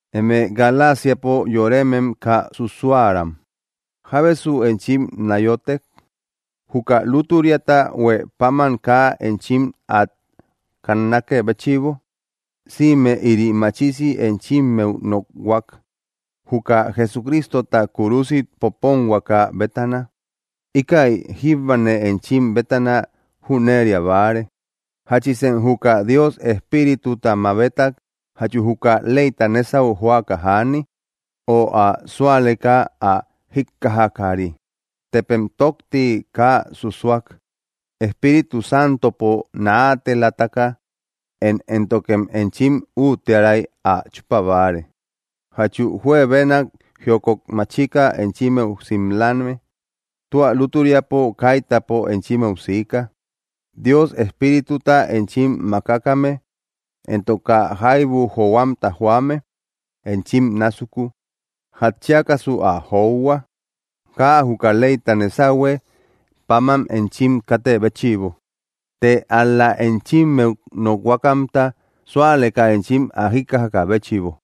Eme Galasiapo yoremem kaa susuäram, ¿jábesu enchim náyotek, juka lútüriata huë paman kaa enchim át kannakë béchïbo? ¡Sïme ïri machisi enchimmeu nokhuak, juka Jesucristota kúrusit poponhuaka bétana! Íkäi, jíbane enchim bétana, jüneria báare: ¿Jáchisem juka Dios Espírituta mabetak jachu juka leyta nésau joaka jäni, ö ä sualeka ä jikkajakari? ¿Tepem tokti kaa susuak? ¿Espíritu Santopo naatelataka én éntokem enchim úttiäray ä chúpa báare? ¿Jachu juebenak jiokot machika enchimmeu simlame? ¡Tua lútüriapo kaitäpo enchimmeu sika! Dios Espírituta enchim mákakame, éntok kaa jaibu johuamta joame enchim násuku, ¿jatchiakasu ä johua? Kaa juka leyta nésahue paman enchim katë béchïbo, të ál‑la enchimmeu nokhuakamta súalekä enchim ä jikkajakä béchïbo.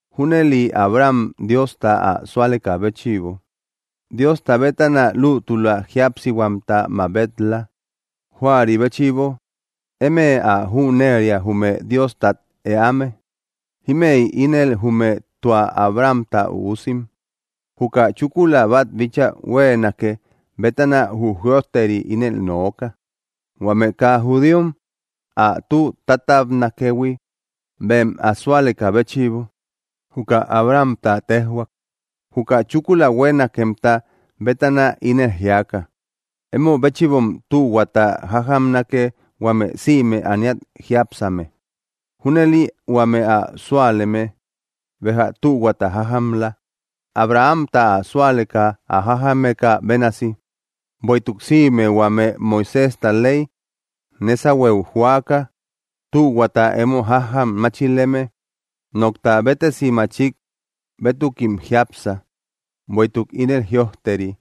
Júnëli Abraham Diosta ä súalekä béchïbo, Diosta bétana lútüla jíapsihuamta mabet‑la. Juäri béchïbo, emë ä jüneria jume Diostat eäme, ímëi ínel jume tua Abrahamta üusim. Juka chúkula bát bíchaa hueenake bétana jü jïojteri ínel nooka, huame kaa judíom ä tü tátabnakëhui bem ä súalekä béchïbo, juka Abrahamta téjhuak, juka chúkula huenakemta bétana ínel jíaka: “Emo béchïbom tühuata jájamnake huame sïme ániat jiápsame.” Júnëli huame ä súaleme béja tühuata jájamla, Abrahamta ä súaleka ä jájamekä bénasi. Bueïtuk sïme huame Moiséjta ley nésahueu joaka tühuata emo jájam máchileme, nokta béttesi machik bétukim jiápsa, bueïtuk ínel jïojteri: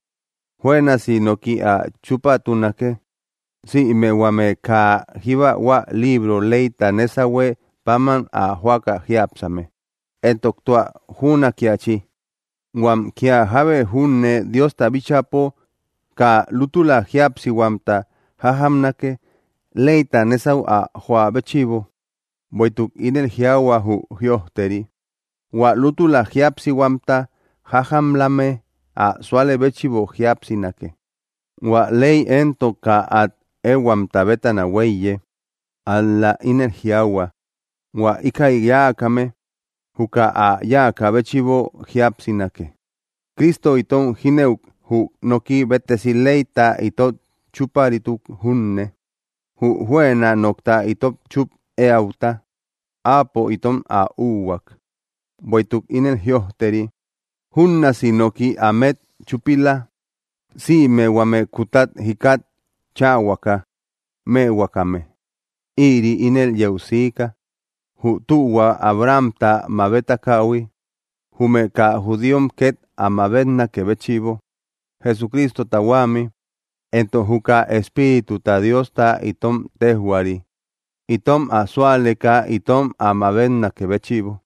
“Juënasi noki át chúpatunake, sïme huame kaa jíba hua libro leyta nésahue paman ä joaka jiápsame.” Éntok tua jünakiachi, huam, kía jábe júne Diosta bíchäpo kaa lútüla jíapsihuamta jájamnake leyta nésau ä joä béchïbo; bueïtuk ínel jiaahua jü jïojteri: “Huä lútüla jíapsihuamta jájamlame ä súalë béchïbo jíapsinake.” Huä ley éntok kaa át ehuamta bétana huéiye, ál‑la ínel jiaahua: “Huä ikäi yáakame, juka ä yáakä béchïbo jíapsinake.” Cristo itom jínëuk jü noki béttesi leyta itot chúparituk junne. Jü juëna nokta itot chúp éäuta, áapo itom ä úhuak; bueïtuk ínel jïojteri: “Júnnaasi noki ámet chúpila, sïme huame kútat jikat cháahuaka mëhuakame.” Ïri ínel yeu siika, jü tühua Abrahamta mabetakähui jume kaa judíom ket ä mabetnakë béchïbo, Jesucristota huämi; éntok juka Espírituta Diosta itom téjhuaari itom ä súaleka itom ä mabetnakë béchïbo.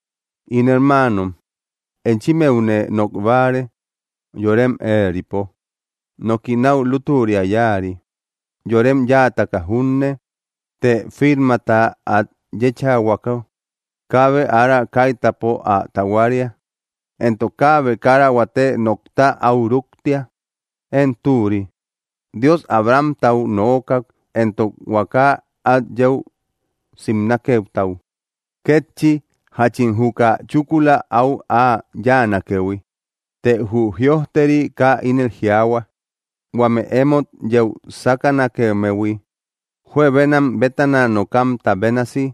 In hermaanom, enchimmeune nok báare yorem éeripo: Noki náu lútüria yáari, yorem yáataka junne, të firmata át yéchahuako, kaabe ára kaitäpo ä tahuaria, éntok kaabe kara huate nokta áu rúktia. Én, türi, Dios Abrahamtau nookak éntok huaka át yeu simnakemtau kétchi jáchin juka chúkula áu ä yáanakëhui. Të jü jïojteri kaa ínel jiaahua: “huame emót yeu sakanakemmehui”, juebenam bétana nokamta bénasi;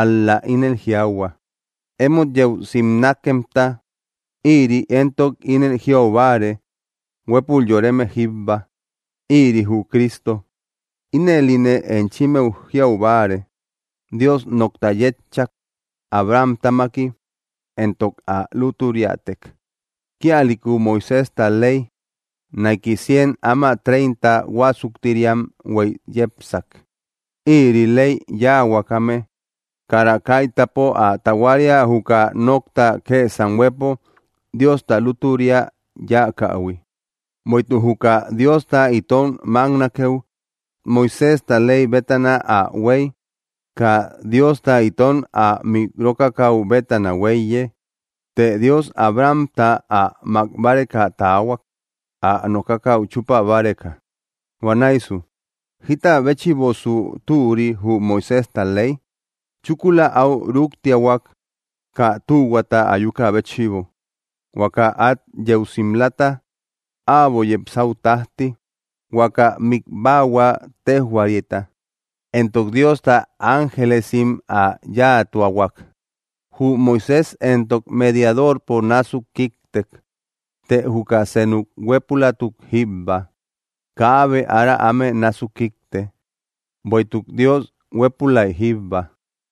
ál‑la inel jiaahua: “emót yeu simnakemta”; irï entok inel jiaubáare huépül yoreme jíbba, ïri jü Cristo. Ínëline enchimmeu jiau báare: Dios nokta yétchak, Abrahamtamaki, entok ä lútüriatek. Kíalïku Moiséjta ley, naiki cien áma treinta huásuktiriam huéy yepsak, irï ley yáahuakame kara kaitäpo ä tahuaria juka nokta kësam huëpo Diosta lútüria yáakähui. Bueïtuk juka Diosta itom máknakeu Moiséjta ley bétana ä huéy, kaa Diosta itom ä mik rókakäu bétana huéiye. Të Dios Abrahamta ä mák báreka taahuak, ä nokakäu chúpa báreka. Huanäisu, ¿jita béchïbosu türi jü Moiséjta ley? Chúkula äu rúktiahuak, kaa tühuata ayukä béchïbo, huaka át yeu simlata äbo yepsäu tájti, huaka mikbahua téjhuarita; éntok Diosta ángelesim ä yáatuahuak. Jü Moisés éntok mediadorpo násuk kíktek. Të juka senuk huépülatuk jíbba, kaabe ára áme násuk kíkte; bueïtuk Dios huépülai jíbba.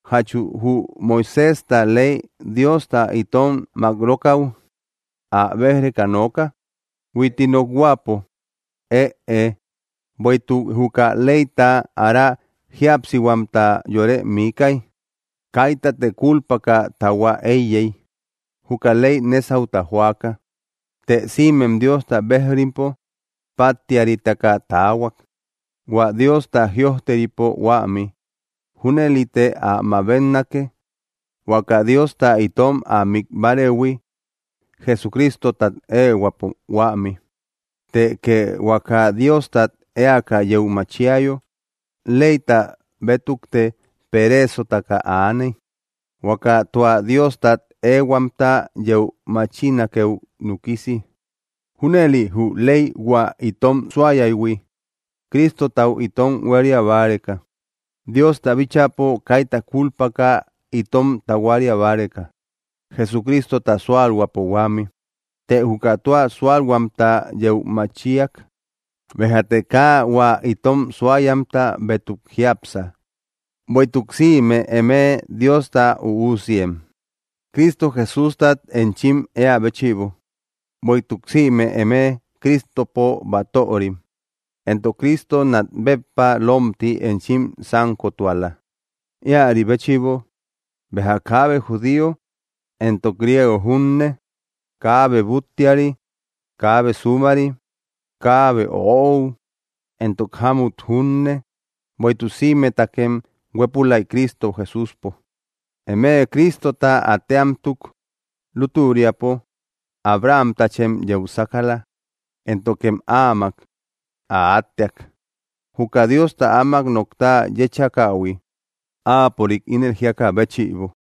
¿Jachu jü Moiséjta ley Diosta itom makrokau ä bej-reka nooka? Huitti nokhuäpo, ëe. Bueïtuk juka leyta ára jíapsihuamta yore míkäi, kaitate kúlpaka tahua éiyey, juka ley nésauta joaka. Të sïmem Diosta bejrimpo páttiaritaka taahuak, hua Diosta jïojteripo huämi. Júnëlite ä mabetnake, huaka Diosta itom ä mik bárëhui, Jesucristotat ehuäpo huämi. Të kee huaka Diostat eaka yeu machiayo, leyta bétukte pereesotaka aaney, huaka tua Diostat ehuamta yeu machinakeu núkisi. Júnëli jü ley hua itom suayaïhui, Cristotau itom huéria báreka, Diosta bíchäpo kaita kúlpaka itom tahuaria báreka, Jesucristota súalhuäpo huämi. Të juka tua súalhuamta yeu machiak, béjate kaa hua itom suayamta bétuk jiápsa. Bueïtuk sïme eme Diosta üusiem, Cristo Jesústat enchim eä béchïbo; bueïtuk sïme eme Cristopo batörim; éntok Cristo nat béppa lómti enchim sankotuala. Íäri béchïbo, béja kaabe judío éntok griego junne; kaabe búttiari, kaabe súmari; kaabe öou éntok jámmut junne; bueïtuk sïmetakem huépülay Cristo Jesúspo. Eme Cristota átteamtuk, lútüriapo Abrahamtachem yeu sákala; éntokem áamak ä átteak, juka Diosta áamak nokta yéchakähui, Áapörik ínel jíakä béchïbo.